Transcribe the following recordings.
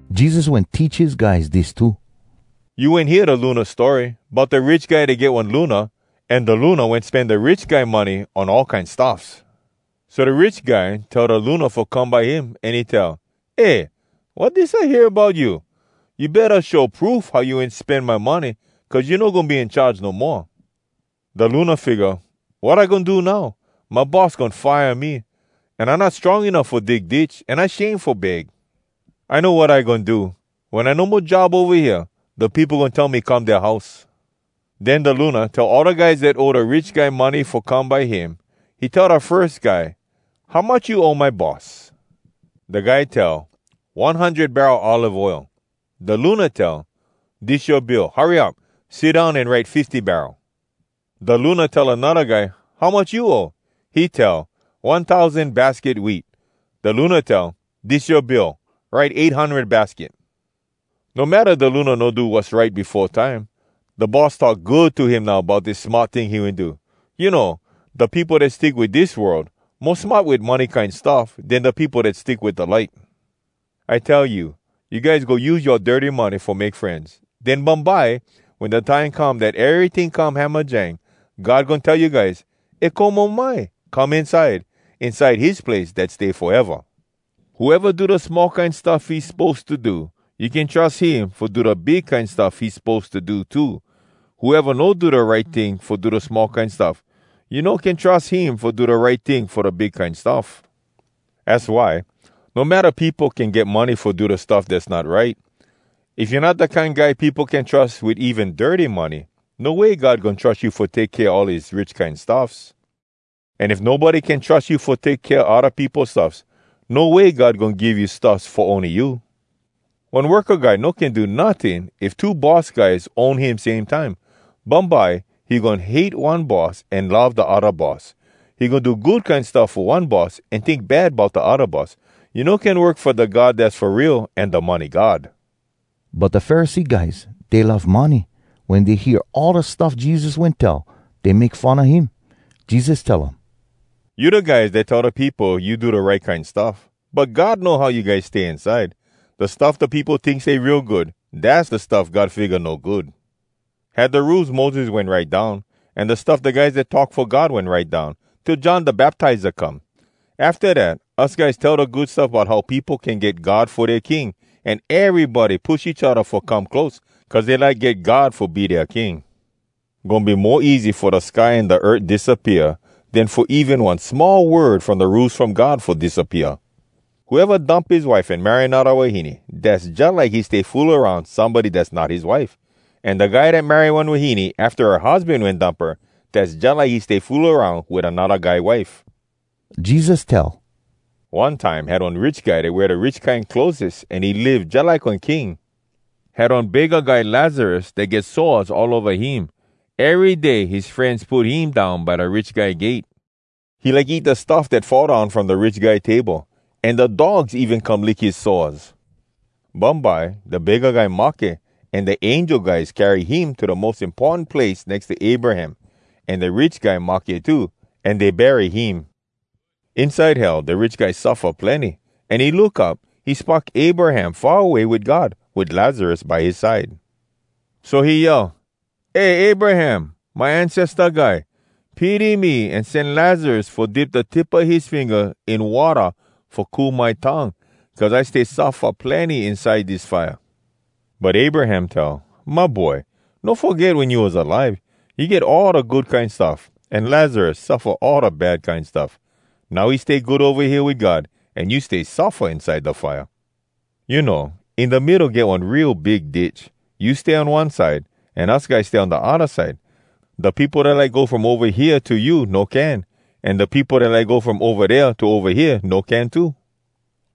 Jesus wen teach his guys dis too: “You wen hear da luna story, bout da rich guy dat get one luna, an da luna wen spen da rich guy money on all kine stuffs? So da rich guy tell da luna fo come by him, an he tell, ‘Eh, wat dis I hear bout you? You betta show proof how you wen spen my money, cuz you no goin be in charge no moa.’ “Da luna figga, ‘Wat I goin do now? My boss goin fire me, an I not strong enuff fo dig ditch, an I shame fo beg. I know wat I goin do. Wen I no mo job ova hea, da peopo goin tell me come dea house.’ “Den da luna tell all da guys dat owe da rich guy money fo come by him. He tell da firs guy, ‘How much you owe my boss?’ Da guy tell, ‘One hundred barrel olive oil.’ Da luna tell, ‘Dis yoa bill. Hurry up! Sit down an write fifty barrel.’ Da luna tell anodda guy, ‘How much you owe?’ He tell, ‘One tousan basket wheat.’ Da luna tell, ‘Dis yoa bill. Write eight hundred basket.’ No matta da luna no do wass right befo time, da boss talk good to him now bout dis smart ting he wen do. You know, da peopo dat stick wit dis world mo smart wit money kine stuff den da peopo dat stick wit da light. “I tell you, you guys go use yoa dirty money fo make frenz. Den bumbye, wen da time come dat eryting come hamajang, God goin tell you guys ‘E komo mai, come inside!’ inside his place dat stay foeva. Whoeva do da small kine stuff he suppose to do, you can trus him fo do da big kine stuff he suppose to do too. Whoeva no do da right ting fo da small kine stuff, you no can trus him fo do da right ting fo da big kine stuff. Az why, no matta peopo can get money fo do stuff dass not right, if you not da kine guy peopo can trus wit even dirty money, no way God goin trus you fo take kea all his rich kine stuffs. An if nobody can trus you fo take kea odda peopo stuffs, no way God goin give you stuffs fo ony you. “One worka guy no can do notting, if two boss guys own him same time. Bumbye he goin hate one boss an love da odda boss. He goin do good kine stuff fo one boss an tink bad bout da odda boss. You no can work fo da God dass fo real an da money god.” But da Pharisee guys, dey love money. Wen dey hear all da stuff Jesus wen tell, dey make fun a him. Jesus tell um, “You da guys dat tell da peopo you do da right kine stuff, but God know how you guys stay inside. Da stuff da peopo tink stay real good, dass da stuff God figga no good.” “Had da Rules Moses wen write down, an da stuff da guys dat talk fo God wen write down, till John Da Baptiza come. Afta dat us guys tell da Good Stuff bout how peopo can get God fo dea king, an erybody push each odda fo come close, cuz dey like get God fo be dea king. Goin be mo easy fo da sky an da earth disappea, den fo even one small word from da Rules From God fo disappea. “Whoeva dump his wife an marry anodda wahine, dass jalike he stay fool aroun somebody dass not his wife. An da guy dat marry one wahine afta her husban wen dump her, dass jalike he stay fool aroun wit anodda guy wife.” Jesus tell, “One time had one rich guy dat wear da rich kine clotheses an he live jalike one king. Had one begga guy Lazarus dat get sores all ova him. Ery day his frenz put him down by da rich guy gate. He like eat da stuff dat fall down from da rich guy table. An da dogs even come lick his sores. “Bumbye da begga guy mahke an da angel guys carry him to da mos importan place nex to Abraham. An da rich guy mahke too, an dey bury him. Inside Hell da rich guy suffa plenny, an he look up. He spock Abraham far away wit God, wit Lazarus by his side. “So he yell, ‘Eh Abraham, my ancesta guy! Pity me an sen Lazarus fo dip da tip a his finga in watta fo cool my tongue, cuz I stay suffa plenny inside dis fire!’ “But Abraham tell, ‘My boy, no foget wen you was alive, you get all da good kine stuff, an Lazarus suffa all da bad kine stuff. Now he stay good ova hea wit God, an you stay suffa inside da fire. You know, in da middo get one real big ditch. You stay on one side, an us guys stay on da odda side. Da peopo dat like go from ova hea to you no can, an da peopo dat like go from ova dea to ova hea no can too.’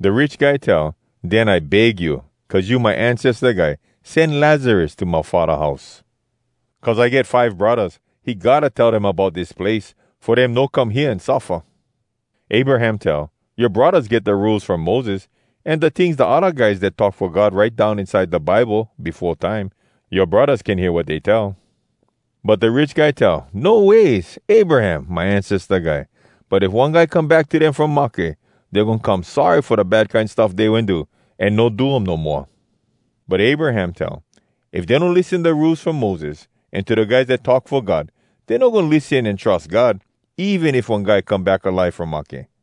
“Da rich guy tell, ‘Den I beg you, cuz you my ancesta guy, sen Lazarus to my faddah house. Cuz I get five braddahs. He gotta tell dem bout dis place, fo dem no come hea an suffa.’ “Abraham tell, ‘Yoa braddahs get da Rules From Moses, an da tings da odda guys dat talk fo God write down inside da Bible befo time. Yoa braddahs can hear wat dey tell.’ “But da rich guy tell, ‘No ways, Abraham, my ancesta guy! But if one guy come back to dem from mahke, dey goin come sorry fo da bad kine stuff dey wen do, an no do um no moa.’ “But Abraham tell, ‘If dey no lissen da Rules From Moses, an to da guys dat talk fo God, dey no goin lissen an trus God, even if one guy come back alive from mahke.’”